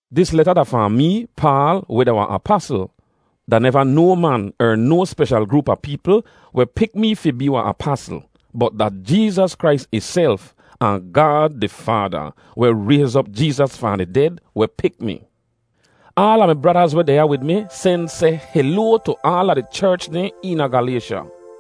Dis leta da fahn mee, Paal, weh da wahn apasl. Da neva no man er no speshal groop a peepl weh pik mi fi bee wahn apasl, bot da Jeezas Krais ihself ahn Gaad di Faada, weh rayz op Jeezas fahn di ded, weh pik mi. Aala mi bradaz weh deh ya wid mi sen seh heloa tu aala di cherch dehn eena Galaysha.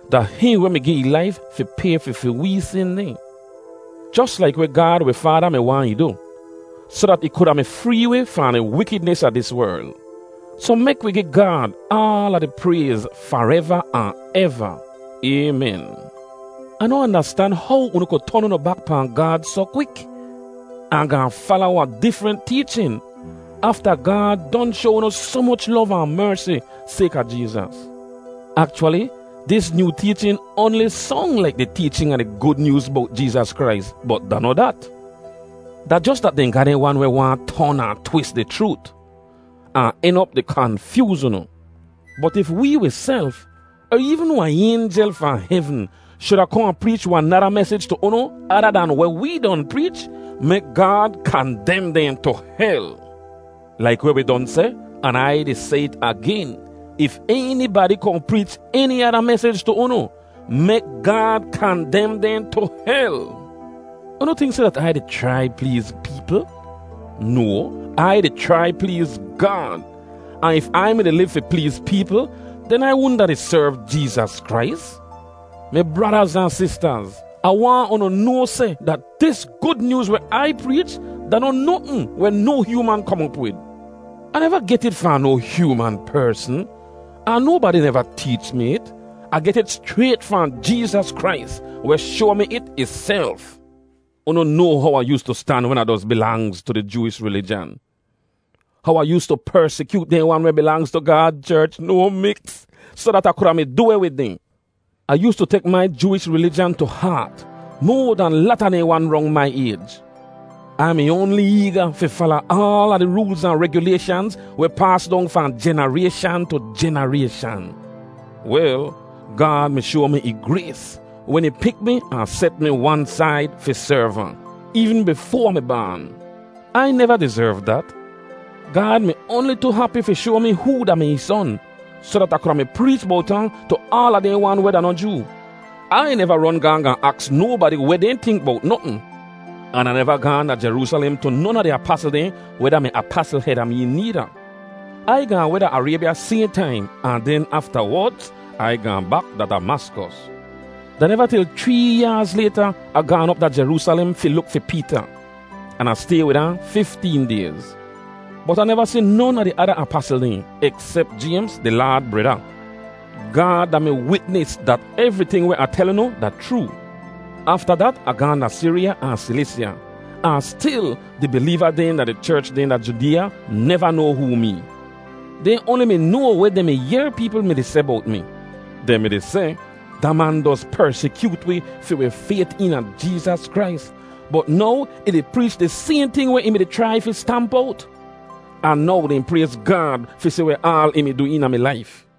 Da hihn weh mi gi ih laif fi pay fi fi wee sin dehn, jos laik weh Gaad wi Faada mi waahn ih du, soh dat ih kuda mi free wi fahn di wikidnis a dis werl. Soh mek wi gi Gaad aala di prayz fareva ahn eva. Aymen. Ah noh andastan how unu ku ton unu bak pahn Gaad soh kwik, ahn gaahn fala wahn difrent teechin, afta Gaad don shoa unu soh moch lov ahn mersi sayka Jeezas. Akchwali, dis nyoo teechin oanli song laik di teechin a di Gud Nyooz bowt Jeezas Krais, bot da noh dat. Da jos dat dehn ga dehn wan weh waahn ton ahn twis di chroot, ahn en op di kanfyooz unu. Bot if wee wiself, er eevn wahn aynjel fahn hevn, shuda kohn ahn preech wahn nada mesij tu unu ada dahn weh wee don preech, mek Gaad kandem dehn tu hel! Laik weh wi don seh, an Ai di seh it agen, if enibadi kohn preech eni ada mesij tu unu, mek Gaad kandem dehn tu hel! Unu tink seh dat Ai di chrai pleez peepl? No! Ai di chrai pleez Gaad. Ahn if Ai mi-di liv fi pleez peepl, den Ai wudn a di serv Jeezas Krais. Mi bradaz ahn sistaz, Ah waahn unu noa seh dat dis Gud Nyooz weh Ai preech da noh notn weh no hyooman kom op wid. Ah neva get it fahn no hyooman persn, ahn nobadi neva teech mi it. Ah get it schrayt fahn Jeezas Krais, weh shoa mi it ihself. Unu noa how Ah yoostu stan wen Ah doz bilangz tu di Jooish rilijan; how Ah yoostu persikyoot dehn wan weh bilangz tu Gaad cherch no miks soh dat Ah kuda mi du weh wid dehn. Ah yoostu tek mai Jooish rilijan tu haat moa dahn lata dehn wan rong mai ayj. Ai mi oanli eega fi fala aala di roolz ahn regyulayshanz weh paas dong fahn jenarayshan tu jenarayshan. Wel, Gaad mi shoa mi ih grays wen ih pik mi ahn set mi wan said fi serv ahn, eevn bifoa Ah mi baan. Ai neva dizerv dat. Gaad mi oanli tu hapi fi shoa mi hoo da-mi ih Son, soh dat Ah kuda mi preech bowt ahn tu aala dehn wan weh da noh Joo. Ai neva ron gaahn gaahn aks nobadi weh dehn tink bowt notn, an Ah neva gaahn da Jeroosalem tu non a di apasl dehn weh da-mi apasl heda mee needa. Ai gaahn weh da Araybya sayhn taim, ahn den aftawodz, Ai gaahn bak da Damaskos. Da neva til chree yaaz layta Ah gaan op da Jeroosalem fi luk fi Peeta, an Ah stay wid ahn fifteen dayz; bot Ah neva si non a di ada apasl dehn, eksep Jaymz, di Laad breda. Gaad da mi witnis dat evriting weh Ah tel unu da chroo. Afta dat Ah gaahn da Siriya ahn Silisya, ahn stil di bileeva dehn da di cherch dehn da Judeeya neva noa hoo mee. Dehn oanli mi noa weh dehn mi yehr peepl mi-di seh bowt mi. Dehn mi-di seh, “Da man doz persikyoot wi fi wi fayt eena Jeezas Krais, bot now ih di preech di sayhn ting weh ih mi-di chrai fi stamp owt!” Ahn now dehn prayz Gaad fi si weh aal ih mi du eena mi laif.